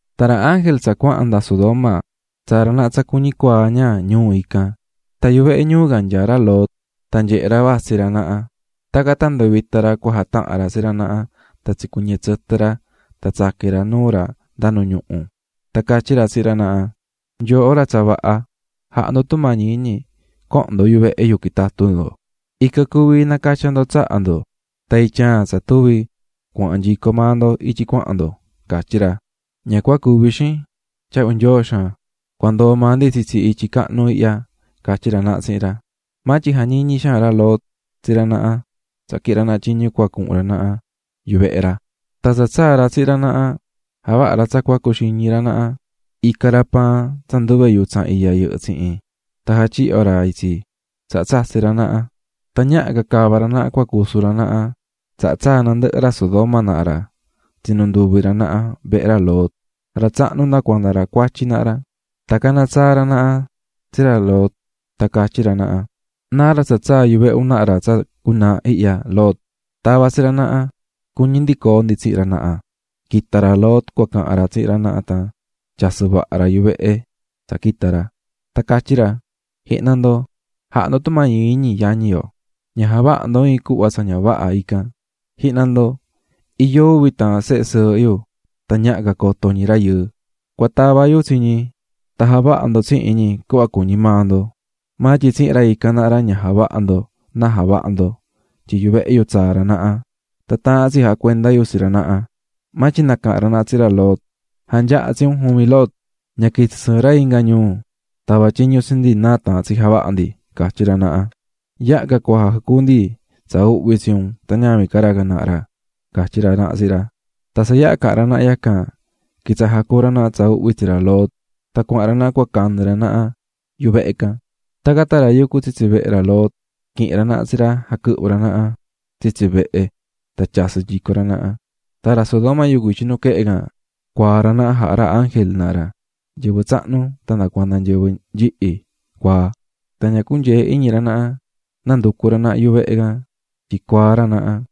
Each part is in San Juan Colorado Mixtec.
Tan ra ángel tsa cuahan nda Sodoma, tsaa̱ ra naha tsa cuñi cuaa ña ñuu ican. Tan yuhu vehe ñuu can nyaá ra Lot tan nyehe̱ ra tsi ra naha. Tacan tan nduvita̱ ra cua jatahan ra tsi ra naha tan tsicuɨñɨ tsɨtɨ ra tan tsaqui̱n ra nuu ra nda nu ñuhu. Tan catyí ra tsihin ra naha: --Nyooho ra tsa vaha, ja̱ha ndo tumañi iñi co̱hon ndo yuvehe yu quitatu ndo, ican cuvi nacatya ndo tsaha ndo, tan ityaan tsa tuvi cuhun nyico maa ndo ityi cuahan ndo --catyí ra. --Ña cua cuvi, xin. Tyahvi Nyoo xaan. Cua ndoo maa ndi tsitsi ityi cahnu ihya --catyí ra naha tsihin ra. Maa tyin jañiñi̱ xaan ra Lot tsi ra naha, tsaha quihi̱n ra naha tyiñu cuahan ra naha yuvehe ra, tan tsa tsaa̱ ra tsihin ra naha, javaha̱ ra tsa cuxiñi ra naha; ica̱ ra paan tsa nduve yutsan iya yɨhɨ́ tsihin, jatyihyo̱ ra itsi, tan tsatsi̱ ra naha. Tan ñaha ca cava ra naha nu cua cusu ra naha, tsaha tsaa̱ nandɨhɨ ra Sodoma naha ra, tsinu̱ nduvi ra naha vehe ra Lot. Ra tsahnu nda cuanda ra cuatyi naha ra. Tan caná tsaa ra naha tsi ra Lot tan catyí ra naha: --¿Náa ra tsa tsaa̱ yuvehe un naha ra tsa cunaaha ihya, Lot? ¡Ta̱va tsi ra naha! ¡Cuñí ndi coo ndi tsihin ra naha! Quita̱ ra Lot cahan ra tsihin ra naha, tan tyasɨ̱ vaha ra yuhu vehe tsa yaha̱ quita̱ ra. Tan catyí ra: --Ja̱ha ndo tumañi iñi, yañi yo, ña ja̱vaha ndo tsa ña vaha ican. Ji̱hna ndo, iyó uvi taahan sehe sɨɨhɨ yu tan ñaha ca coto ñi rayɨɨ; cua tava yu tsi ñi tan javaha ndo tsihin ñi cuhva cuñi maa ndo. Maa tyin tsihin ra ican naha ra ña javaha ndo náa javaha ndo, tyin yuvehe yu tsaa̱ ra naha tan taahán tsi jacuenda yu tsi ra naha. Maa tyin nacaha̱n ra naha tsihin ra Lot: --¡Ja̱nyaha tsi un juvin, Lot! Ña quitsi sɨɨn ra inga ñuu tava tyiñu tsi ndi náa taahán tsi javaha ndi --catyí ra naha--. ¡Yaha ca cua jacuu ndi tsa uhvi tsi un tan ñavin ca ra can naha ra! --catyí ra naha tsihin ra. Tan tsa yaha caha̱n ra naha yacan, quitsaha̱ jacuú ra naha tsa uhvi tsi ra Lot. Tan cuahan ra naha cua canɨ ra naha yuhu vehe can. Tacan tan ra yucú tsitsi vehe ra Lot, quihi̱n ra naha tsi ra jaquɨhvɨ̱ ra naha tsitsi vehe tan tyasɨ̱ nyico ra naha. Tan ra Sodoma yucú nuquehe, cuaa̱ ra naha jaha̱ ra ángel can naha ra, tahan ñi nyɨvɨ tsahnu tan nyɨvɨ nyihi, tan ña cunyee̱ iñi ra naha nanducu̱ ra naha yuhu vehe can tyin cuaá ra naha.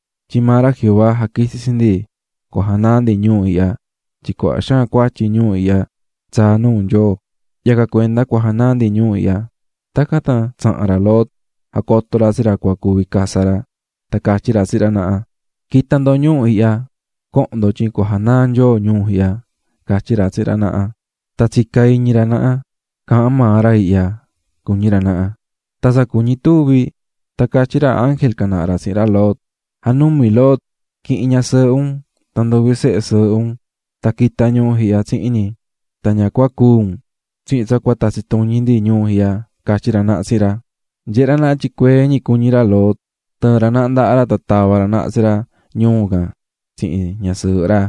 Tyin maa ra Jehová jaquitsi̱ tsi ndi. janaa ndi ñuu ihya. Tyin cuaha xaan cuatyi nyɨvɨ ñuu ihya tsaá nuu ra, yacan cuenda cua janaa ndi ñuu ihya. Tacan tan tsaha̱n ra Lot jacoto̱ ra tsi ra cua cuvi casa ra, tan catyí ra tsihin ra naha: --¡Naha ndo, co̱hon ndo cua quita yo ñuu ihya tyin Nyoo cua janaa ra itsi! --catyí ra tsihin ra naha. Tan tsicá iñi ra naha: "Caahán maa ra ihya", cuñí ra naha. Tan tsa cuñí tuvi, catyí ra ángel can naha ra tsihin ra Lot: --Ja̱numi Lot, qui̱hin ñasɨɨhɨ un tan nduvi sehe sɨɨhɨ un, qui̱ta ndo ñuu ihya. Na ña cúu un tsihin tsa cua tatsi tuñi ndi ñuu ihya --catyí ra naha tsihin ra. Nyehé ra naha tyin cuee ñi cuñí ra Lot. Tɨɨ̱n ra naha ndaha ra tan tava̱ ra naha tsi ra ñuu can tsihin ñasɨɨhɨ ra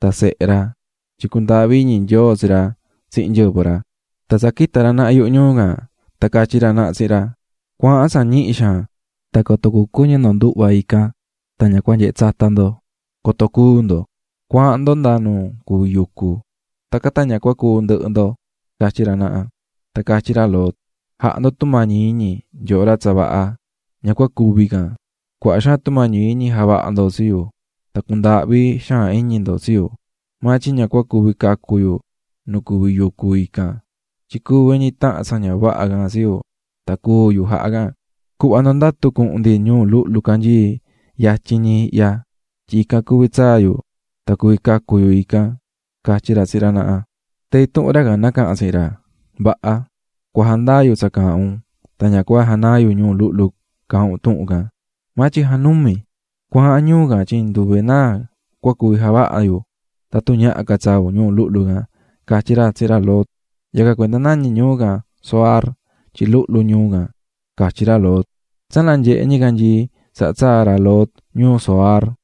tan sehe ra tyin cundaahvi̱ iñi Nyoo tsi ra tsihin nyɨvɨ ra. Tan tsa quita̱ ra naha yuhu ñuu can, catyí ra naha tsihin ra: --Tsa ñihi cuhun ndo coto cucuɨñɨ ndo nduhva ican, ña nanyehe tsata ndo, coto cúu ndo. Cua̱ahan ndo nda nu cuví yucu, tacan tan ña cúu ndɨhɨ ndo --catyí ra naha. Tan catyí ra Lot: --Ja̱ha ndo tumañi iñi, nyooho ra tsa vaha, ña cua cuvi can. Cuaha xaan tumañi iñi javaha̱ ndo tsi yu tan cundaahvi̱ xaan iñi ndo tsi yu, maa tyin ña cua cuvi cacu yu nu cuví yucu ican, tyin cuvi ñi tahan tsa ña vaha can tsi yu, tan cúu yu jaha can. Cu̱hva ndo ndatu cuhun ndi ñuu luhlu canyií yatyin ñi ihya, tyin ican cuvi tsaa yu tan cuvi cacu yu --catyí ra tsihin ra naha. Tan intuhun ra can nacaha̱n tsihin ra: --Vaha, cua jandaa yu tsa caahán un tan ña cua janaa yu ñuu luhlu caahán un tuhun can. Maa tyin ja̱numi, cua̱ahan ñuu can tyin nduve náa cua cuvi ica yu tatun ñaha ca tsaa un ñuu luhlu can --catyí ra tsihin ra Lot. Yacan cuenda nañí ñuu can Zoar tyin luhlu ñuu can, catyí ra Lot. Ndi cuahan nanyehé ñicanyii tan tsaa̱ ra Lot ñuu Zoar.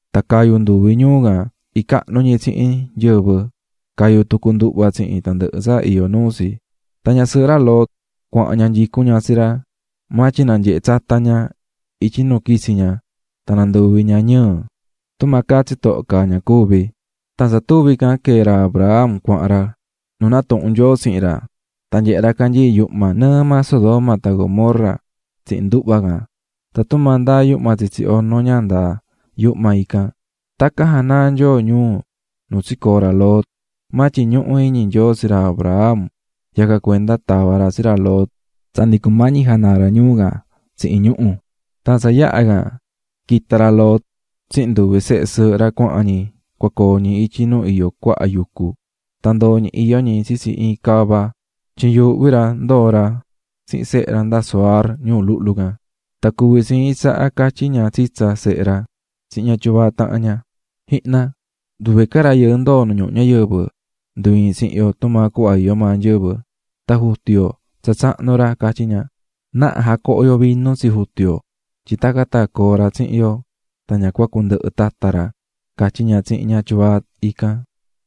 Tan cayu̱ nduvi ñuu can icahnu ñi tsihin nyɨvɨ, cayu̱ tucu nduhva tsihin tandɨhɨ tsa iyó nuu tsi. Tan ñasɨɨhɨ ra Lot cuahan ña nyicún ña tsi ra, maa tyin nanyehe̱ ña ityi nu quitsi̱ ña tan nanduvi̱ ña ñɨɨ, tumaa caá tsitoho caá ña cuvi̱. Tan tsa tuvi can quee̱ ra Abraham cuahan ra nu natuhu̱n Nyoo tsihin ra. Tan nyehe̱ ra canyii̱ yuhma nɨɨ maa Sodoma tan Gomorra tsihin nduhva can, tan tumaa ndaá yuhma tsitsi ono ña ndaá yuhma ican. Tacan janaa̱ Nyoo ñuu nu tsicoo̱ ra Lot, maa tyin ñuhú iñi Nyoo tsi ra Abraham yacan cuenda tava̱ ra tsi ra Lot tsa ndi cumañi janaa ra ñuu can tsihin ñuhu̱. Tan tsa yaha can, quita̱ ra Lot tsihin nduvi sehe sɨɨhɨ ra cuahan ñi cua coo ñi ityi nu iyó cuaha yucu, tan ndoo̱ ñi iyó ñi tsitsi iin cava tyin yuuhvi ra ndoo ra tsihin sehe ra nda Zoar ñuu luhlu can. Tan cuvi̱ tsi iin tsaha catyí ña tsitsa sehe ra tsihin ña tyuvaa tahan ña: --Ji̱hna, nduve ca rayɨɨ ndoo̱ nu ñuhu ñayɨvɨ ndu iin tsihin yo tumaa cuhva iyó maa nyɨvɨ, tan jutu yo tsa tsahnu ra --catyí ña--. Na̱ha jacoho yo vinu tsi jutu yo tyin tacan tan coo ra tsihin yo tan ña cua cundɨhɨ tata ra --catyí ña tsihin ña tyuvaa ican.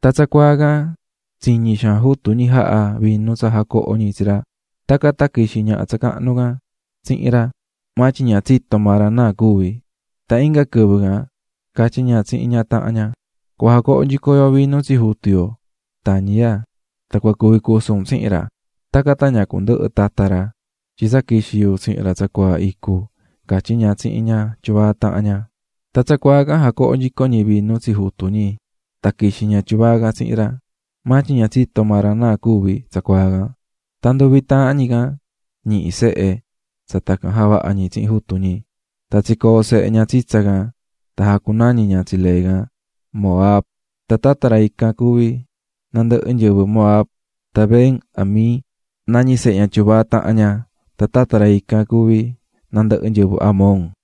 Tan tsacuaa can tsiñi̱ xaan jutu ñi jaha̱ vinu tsa jacoho̱ ñi tsi ra. Tacan tan quixi̱ ñaha tsa cahnu can tsihin ra maa tyin ña tsito̱ maa ra náa cuvi̱. Tan inga quɨvɨ can catyí ña tsihin ñaha tahan ña: --Cua jacoho nyico yo vinu tsi jutu yo tañiya tan cua cuvi cusu un tsihin ra. Tacan tan ña cundɨhɨ tata ra, tyin tsa quixi̱ yu tsihin ra tsacuaa icu --catyí ña tsihin ña tyuvaa tahan ña. Tan tsacuaa can jacoho̱ nyico ñi vinu tsi jutu ñi, tan quixi̱ ña tyuvaa can tsihin ra, maa tyin ña tsito̱ maa ra náa cuvi̱ tsacuaa ican. Tan nduvi taahan ñi can, ñihi̱ sehe ñi tsa tacan javaha̱ ñi tsihin jutu ñi. Tan tsicoo̱ sehe ña tsitsa ican tan jacunañi̱ ña tsi lee can Moab, tan tata ra ican cuví nandɨhɨ nyɨvɨ Moab. Tan Ben-ammi nañí sehe ña tyuvaa tahan ña, tan tata ra can cuví nandɨhɨ nyɨvɨ Amon.